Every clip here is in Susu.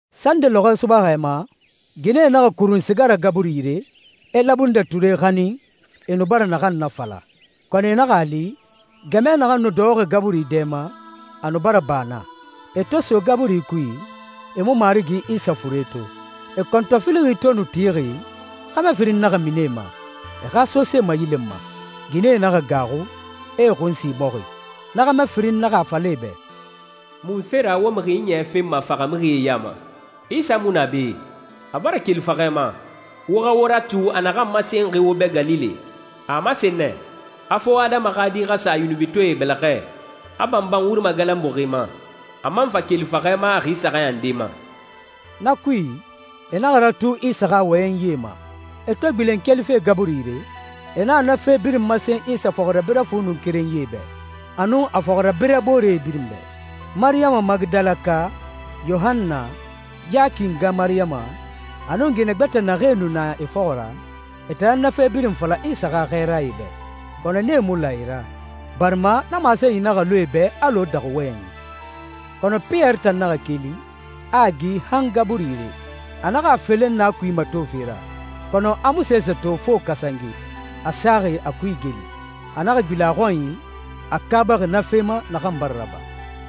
Sande lɔxɔɛ subaxɛ ma, ginɛe naxa kurun siga ra gaburi yire, e labundɛ ture xanin, e nu bara naxan nafala. Kɔnɔ e naxa a li, gɛmɛ naxan nu dɔxɔxi gaburi dɛ ma, a nu bara ba naa. E to so gaburi kui, e mu Marigi Isa fure to. E kɔntɔfilixi to nu tixi, xɛmɛ firin naxa mini e ma, e xa sosee mayilenma. Ginɛe naxa gaaxu, e e xun sin bɔxi. Na xɛmɛ firin naxa a fala e bɛ, «Munfe ra wo mixi ɲiɲɛ fenma faxamixie ya ma? Isa mu na be, a bara keli faxɛ ma. Wo xa wo ratu a naxan masenxi wo bɛ Galile. A a masen nɛ, a fo Adama xa Di xa sa yunubitɔɛe bɛlɛxɛ, a banban wuri magalanbuxi ma, a man fa keli faxɛ ma a xi saxan nde ma.» Na kui, e naxa ratu Isa xa wɔyɛnyie ma. E to gbilen kelife gaburi yire, e naxa na fe birin masen Isa fɔxirabirɛ fu nu kerenyie bɛ, a nun a fɔxirabirɛ boore birin bɛ. Mariyama Magidalaka, Yohanna, Yaki nga Mariyama, a nun ginɛ gbɛtɛe naxee nu na e fɔxɔ ra, e tan nan na fe birin fala Isa xa xɛɛrae bɛ. Kɔnɔ nee mu la e ra, barima na masenyi naxa lu e bɛ alɔ daxu wɔyɛnyi. Kɔnɔ Piyɛri tan naxa keli, a a gi han gaburi yire. A naxa a felen na kui matofe ra, kɔnɔ a mu sese to fo kasange, a saxi a kui igeli. A naxa gbilen a xɔnyi, a kaabaxi na fe ma naxan bara raba.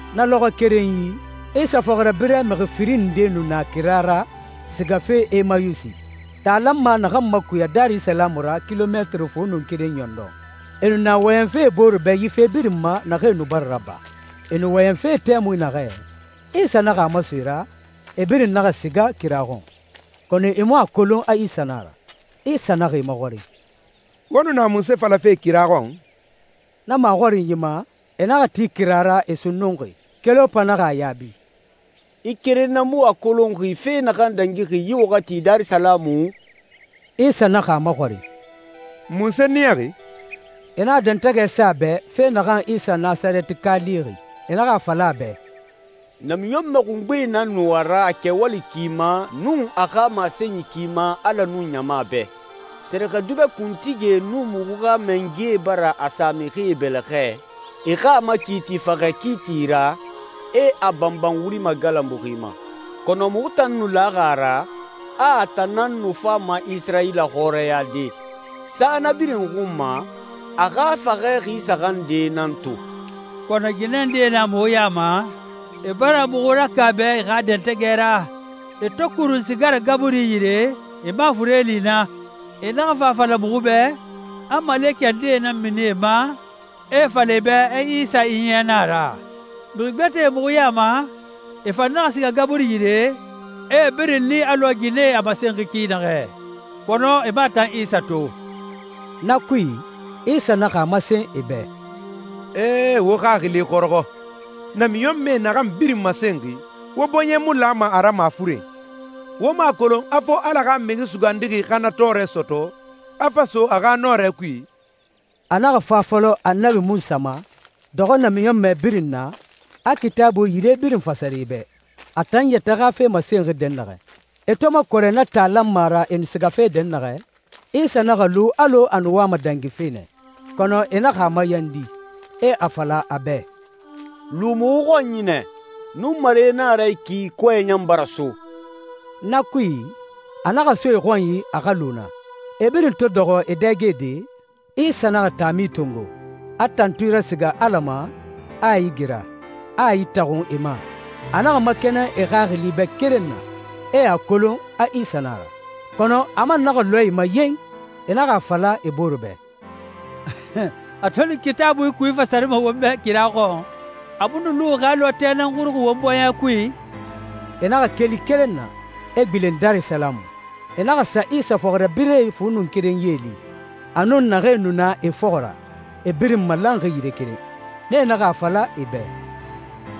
Na lɔxɔɛ kerenyi, Isa fɔxirabirɛ mixi firin ndee nu na kira ra sigafe Emayusi, taa lanma naxan makuya Darisalamu ra kilomɛtiri fu nun keren ɲɔndɔn. E nu na wɔyɛnfe e bore bɛ yi fe birin ma naxee nu bara raba. E nu wɔyɛnfe tɛmui naxɛ, Isa naxa a maso e ra, e birin naxa siga kira keren xɔn, kɔnɔ e mu a kolon a Isa nan a ra. Isa naxa e maxɔrin, «Wo nu na munse falafe kira xɔn?» Na maxɔrinyi ma, e naxa ti kira ra, e sunnunxi. Kelopa naxa a yaabi, «I keren nan mu a kolonxi fe naxan dangixi yi waxati Darisalamu?» Isa naxa a maxɔrin, «Munse niyaxi?» E naxa dɛntɛgɛ sa a bɛ fe naxan Isa Nasarɛtika lixi. E naxa a fala a bɛ, «Namiɲɔnmɛ xungbe nan nu a ra a kɛwali ki ma nun a xa masenyi ki ma Ala nun ɲama bɛ. Sɛrɛxɛdubɛ kuntigie nun muxu xa mangɛe bara a sa mixie bɛlɛxɛ, e xa a makiiti faxɛ kiiti ra, e a banban wuri magalanbuxi ma. Kɔnɔ muxu tan nan nu laxi a ra, a a tan nan nu fama Isirayila xɔrɛyade. Sa na birin xun ma, a xa faxɛ xi saxan nde nan to, kɔnɔ ginɛ ndee na muxu ya ma, e bara muxu rakaaba e xa dɛntɛgɛ ra. E to kurun siga ra gaburi yire, e mu a fure li naa. E naxa fa a fala muxu bɛ, a malekɛ ndee nan mini e ma, e a fala e bɛ a Isa ɲiɲɛ na a ra. Mixi gbɛtɛe muxu ya ma, e fan naxa siga gaburi yire, e a birin li alɔ ginɛe a masenxi ki naxɛ, kɔnɔ e mu a tan Isa to.» Na kui, Isa naxa a masen e bɛ, «Ee, wo xaxili xɔrɔxɔ! Namiɲɔnmɛe naxan birin masenxi, wo bɔɲɛ mu lama a ra mafuren! Wo mu a kolon a fo Ala xa Mixi Sugandixi xa na tɔɔrɛ sɔtɔ, a fa so a xa nɔrɛ kui?» A naxa fa a fɔlɔ Annabi Munsa ma, dɔxɔ namiɲɔnmɛ birin na, a Kitaabuie yire birin fasari e bɛ, a tan yɛtɛ xa fe masenxi dɛnnaxɛ. E to makɔrɛ na taa lanma ra e nu sigafe dɛnnaxɛ, Isa naxa lu alɔ a nu wama dangife nɛ, kɔnɔ e naxa a mayandi, e a fala a bɛ, «Lu muxu xɔnyi nɛ. Nunmare na a ra yi ki, kɔɛ ɲan bara so.» Na kui, a naxa so e xɔnyi a xa lu naa. E birin to dɔxɔ e dɛgede, Isa naxa taami tongo, a tantui rasiga Ala ma, a a igira, a a itaxun e ma. A naxa makɛnɛn e xaxili bɛ keren na, e a kolon a Isa na a ra, kɔnɔ a man naxa lɔɛ e ma yen! E naxa a fala e bore bɛ, «A to nu Kitaabui kui fasarima won bɛ kira xɔn, a mu nu luxi xɛ alɔ a tɛ nan xuruxi won bɔɲɛ kui?» E naxa keli keren na, e gbilen Darisalamu. E naxa sa Isa fɔxirabirɛ fu nun kerenyie li, a nun naxee nu na e fɔxɔ ra, e birin malanxi yire keren. Nee naxa a fala e bɛ,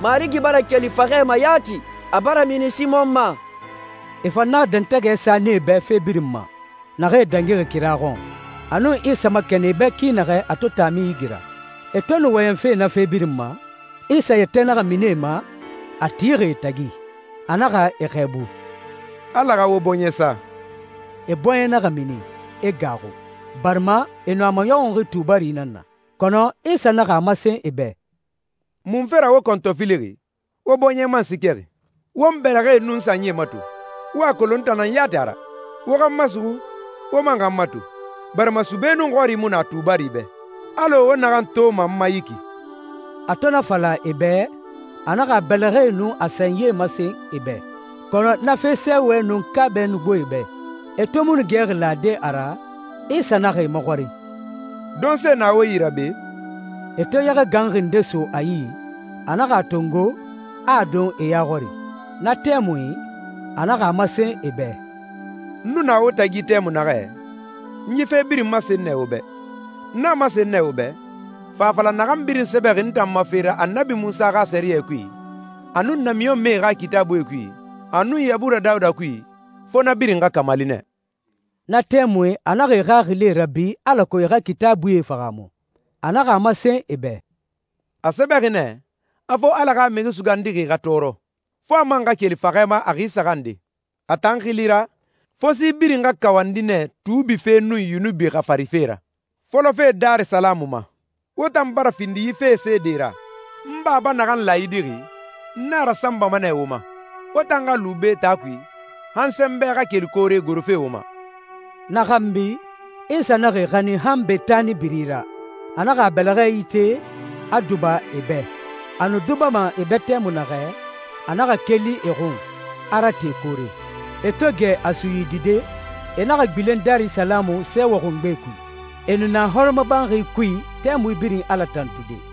«Marigi bara keli faxɛ ma yati! A bara mini Simɔn ma!» E fan naxa dɛntɛgɛ sa nee bɛ fe birin ma naxee dangixi kira xɔn, a nun Isa makɛnɛn e bɛ ki naxɛ a to taami igira. E to nu wɔyɛnfe na fe birin ma, Isa yɛtɛ naxa mini e ma, a tixi e tagi. A naxa e xɛɛbu, «Ala xa wo bɔɲɛ sa.» E bɔɲɛ naxa mini, e gaaxu, barima e nu a maɲɔxunxi tubari nan na. Kɔnɔ Isa naxa a masen e bɛ, «Munfe ra wo kɔntɔfilixi, wo bɔɲɛ man siikɛxi? Wo n bɛlɛxɛe nun n sanyie mato, wo xa a kolon n tan nan yati a ra. Wo xa n masuxu, wo xa n mato, barima sube nun xɔri mu na tubari bɛ, alɔ wo naxan toma n ma yi ki.» A to na fala e bɛ, a naxa a bɛlɛxɛe nun a sanyie masen e bɛ, kɔnɔ na fe sɛɛwɛ nun kaabɛ nu gbo e bɛ. E to mu nu gɛxi lade a ra, Isa naxa e maxɔrin, «Donse na wo yi ra be?» E to yɛxɛ ganxi nde so a yi, a naxa a tongo, a a don e ya xɔri. Na tɛmui, a naxa a masen e bɛ, «N nu na wo tagi tɛmui naxɛ, n yi fe birin masen nɛ wo bɛ. N a masen nɛ wo bɛ, fa fala naxan birin sɛbɛxi n tan ma fe ra Annabi Munsa xa sɛriyɛ kui, a nun namiɲɔnmɛe xa Kitaabuie kui, a nun Yabura Dawuda kui, fo na birin xa kamali nɛ.» Na tɛmui, a naxa e xaxili rabi alako e xa Kitaabuie fahaamu. A naxa a masen e bɛ, «A sɛbɛxi nɛ, a fo Ala xa Mixi Sugandixi xa tɔɔrɔ, fo a man xa keli faxɛ ma a xi saxan nde. A tan xili ra, fo si birin xa kawandi nɛ tuubi fe nun yunubi xafarife ra, fɔlɔfe Darisalamu ma. Wo tan bara findi yi fee seedee ra. N Baba naxan laayidixi, n na rasanbama nɛ wo ma. Wo tan xa lu be taa kui, han sɛnbɛ xa keli koore gorofe wo ma.» Na xanbi, Isa naxa e xanin han Betani biri ra. A naxa a bɛlɛxɛ ite, a duba e bɛ. A nu dubama e bɛ tɛmui naxɛ, a naxa keli e xun, a rate koore. E to gɛ a suyidide, e naxa gbilen Darisalamu sɛɛwɛ xungbe kui. E nu na hɔrɔmɔbanxi kui tɛmui birin Ala tantude.